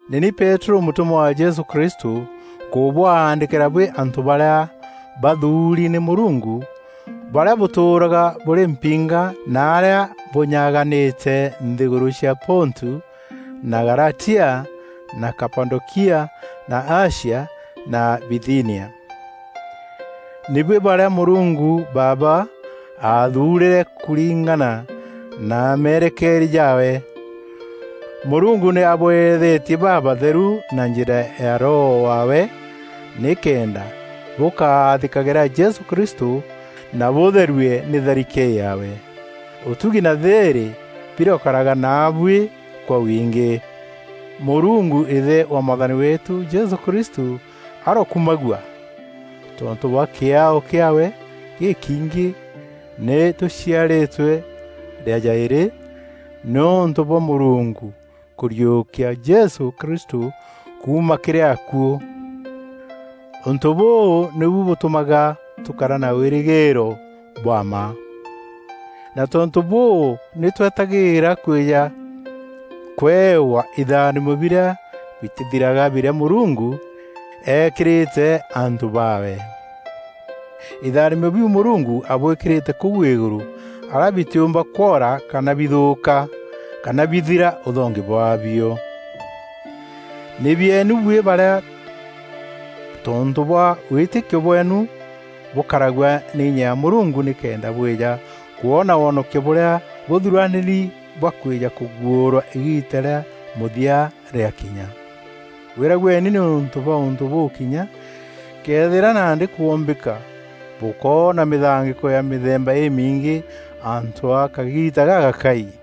Nî ni Peterû mûtûmwa wa Jesû Kristû, nkûbwaandîkîra buî antû barîa bathuuri nî Mûrungu barîa bûtûûraga bûrî mpinga narîa bûnyaganîte nthîgûrû cia Pontu na Galatia na Kapadokia na Asia na Bithinia. Nî bwî barîa Mûrungu Baaba aathuurîre kûringana na meerekeeria jaawe. Mûrungu nî abweethetie babatheru na njîra ya Roho waawe nîkenda bûkaathîkagîra Jesû Kristû na bûtherue nî tharike yaawe. Ûtugi na thîîrî birokaraga naabuî kwa wingî. Mûrungu, Îthe wa Mwathani weetû Jesû Kristû arokumagua! Tontû bwa kîaao kîaawe gîkiingî nî tûciarîtwe rîa jaîrî nîûntû bwa Mûrungu kûriûkia Jesû Kristû kuuma kîrî akuû. Ûntû bûu nîbu bûtûmaga tûkara na wîrîgîîro bwa mma, na tontû bûû, nî twetagîîra kwîja kûewa itharimo birîa bitîthiraga birîa Mûrungu eekîrîte antû baawe. Itharimo biu Mûrungu abwîkîrîte kûu îgûrû arîa bitîûmba kwora kana bithûûka kana bithira ûthongi bwaabio. Nî bieenu buî barîa tontû bwa wîtîkio bweenu bûkaragua nî inya ya Mûrungu nîkenda bwîja kwoona wonokio bûrîa bûthuranîri bwa kwîja kûguûrwa îgiita rîa mûthia rîakinya. Gwîragueni nîûntû bwa ûntû bûu kinya këethîra nandî kwombîka bûkoona mîthangîko ya mîthemba îmiingî antû a kagiita gagakai.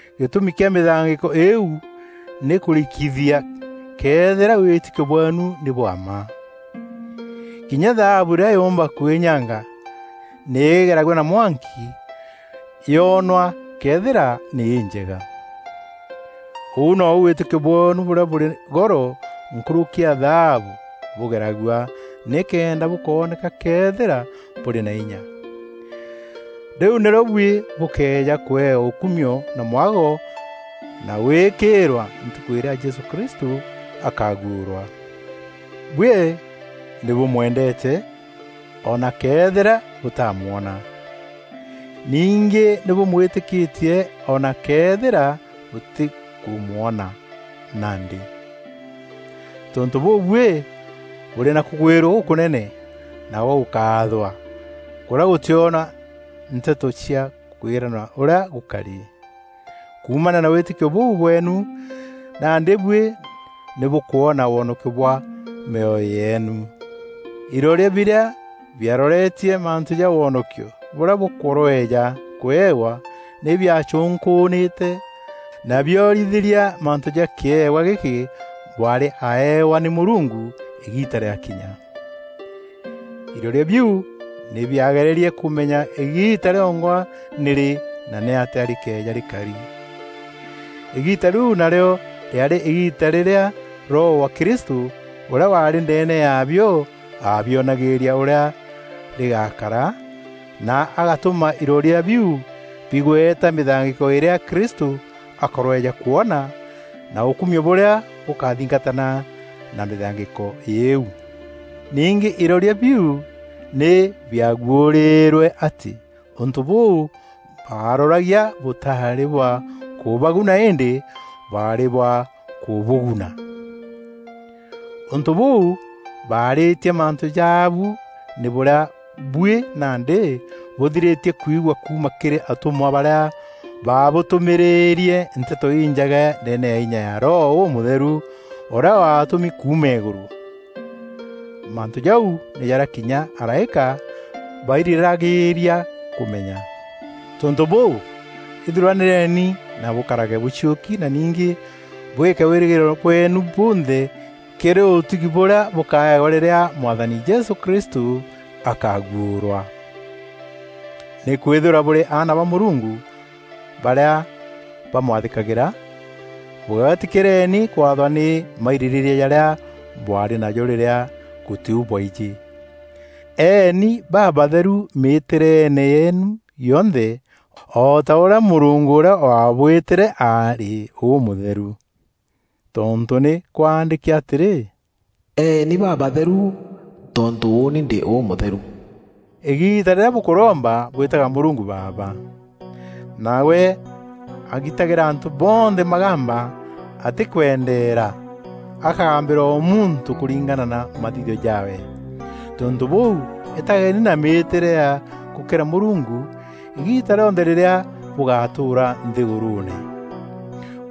Gîtûmi kîa mîthangîko îîu nî kûrikithia këethîra wîtîkio bweenu nî bwa mma. Kinya thaabu îrîa yûmba kwînyanga, nî îgeragua na mwanki yoonwa këethîra nî înjega. Ûu nou wîtîkio bweenu bûrîa bûrî goro nkûrûki ya thaabu, bûgeragua nîkenda bûkooneka këethîra bûrî na inya. Rîu nîrîo buî bûkeeja kûewa ûkumio na mwago na gwîkîîrwa Ntukû îrîa Jesû Kristû akaguûrwa. Buî nî bûmwendeete o na këethîra bûtaamwona. Ningî nî bûmwîtîkîtie o na këethîra bûtîkûmwona nandî. Tontû bûu buî bûrî na kûgwîrua gûkûnene na gwa gûkaathwa kûrîa gûtîona nteto cia kwîrana ûrîa gûkari. Kuumania na wîtîkio bûu bweenu nandî buî nî bûkwona wonokio bwa mîoyo yeenu. Iroria birîa biaroretie mantû ja wonokio bûrîa bûkorweja kûewa nî biacûnkûûnîte na biorithîria mantû ja kîewa gîkî bwaarî aaewa nî Mûrungu îgiita rîakinya. Iroria biu nî biagererie kûmenya îgiita rîongwa nîrî na nîatîa rîkeeja rîkari. Îgiita rîu narîo rîaarî îgiita rîrîa Roho wa Kristû ûrîa waarî ndeene yaabio aabionagîîria ûrîa rîgakara na agatûma iroria biu bigweta mîthangîko îrîa Kristû akorweja kwona na ûkumio bûrîa bûkathingatana na mîthangîko îîu. Ningî iroria biu nî biaguûrîîrwe atî ûntû bûu baaroragia bûtaarî bwa kûbaguna îndî bwaarî bwa kûbûguna. Ûntû bûu baarîtie mantû jaabu, nî bûrîa buî nandî bûthirîtie kwigua kuuma kîrî atûmwa barîa baabûtûmîrîîrie Nteto Injega ndeene ya inya ya Roho Ûmûtheru ûrîa waatûmi kuuma îgûrû. Mantû jau nî jarîa kinya araîka bairîragîîria kûmenya. Tontû bûû, ithuranîreni na bûkarage bûciûki na ningî bwîke wîrîgîîro bweenu bunthe kîrî ûtugi bûrîa bûkaewa rîrîa Mwathani Jesû Kristû akaaguûrwa. Nîkwîthîrwa bûrî aana ba Mûrungu barîa bamwathîkagîra, bûgeetîkîreni kwathwa nî mairîrîîria jarîa bwaarî najo rîrîa gûtî u bwaijî. Eeni babatheru mîtîreene yeenu yonthe o ta ûrîa Mûrungu ûrîa waabwîtîre arî ûmûtheru. Tontû nî kwaandîki atîrî, “Eeni babatheru tontû ûûni ndî ûmûtheru.” Îgiita rîrîa bûkûromba bwîtaga Mûrungu Baaba. Nawe agitagîra antû bonthe magamba atîkwendeera, akagambîra o muntû kûringana na mathithio jaawe. Tontû bûû îtageni na mîîtîre ya gûkîra Mûrungu îgiita rîonthe rîrîa bûgatûûra nthîgûrûûne.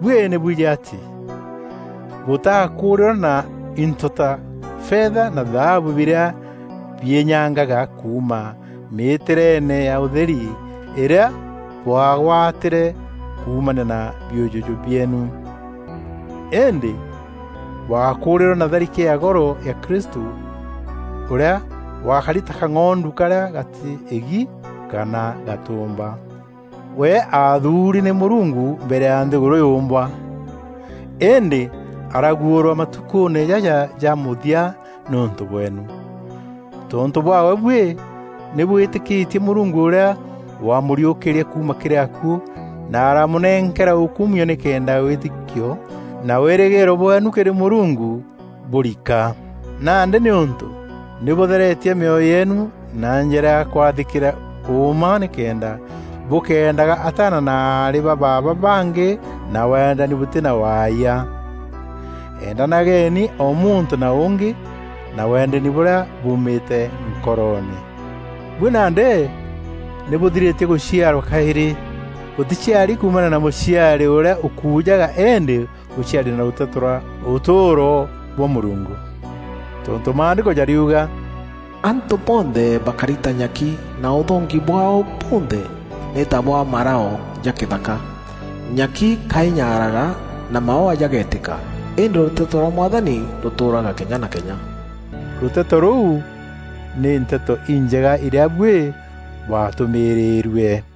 Buî nî bwijî atî bûtaakûûrîrwe na into ta fetha na thaabu birîa biînyangaga kuuma mîtîreene ya ûtheri îrîa bwaagwatîre kuumania na biûjûjû bieenu. Îndî bwakûûrîrwe na tharike ya goro ya Kristû, ûrîa wakari ta kang'ondu karîa gatî îgi kana gatûmba. We aathuuri nî Mûrungu mbere ya nthîgûrû yûmbwa, îndî araguûrwa matukûûne jaja ja mûthia nîûntû bweenu. Tontû bwaawe buî nî bwîtîkîtie Mûrungu ûrîa wamûriûkîrie kuuma kîrî akuû na aramûnenkera ûkumio nîkenda wîtîkio na wîrîgîîro bweenu kîrî Mûrungu bûriika. Nandî nîûntû nî bûtheretie mîoyo yeenu na njîra ya kwathîkîra ûûma nîkenda bûkendaga ataana na aarî ba baaba bangî na wendani bûtî na waayia, endanageni o muntû na ûngî na wendani bûrîa buumîte nkoroone. Buî nandî nî bûthirîtie gûciarwa kaîrî. Bûtîciari kuumania na mûciari ûrîa ûkujaga îndî bûciari nî rûteto rwa ûtûûro rwa Mûrungu. Tontû Maandîko jariuga, “Antû bonthe bakari ta nyaki na ûthongi bwaao bunthe nî ta bwa marao ja kîthaka. Nyaki ka inyaaraga na maûa jagetîka, îndî rûteto rwa Mwathani rûtûûraga kenya na kenya.” Rûteto rûu nî Nteto Injega irîa buî bwaatûmîrîîrue.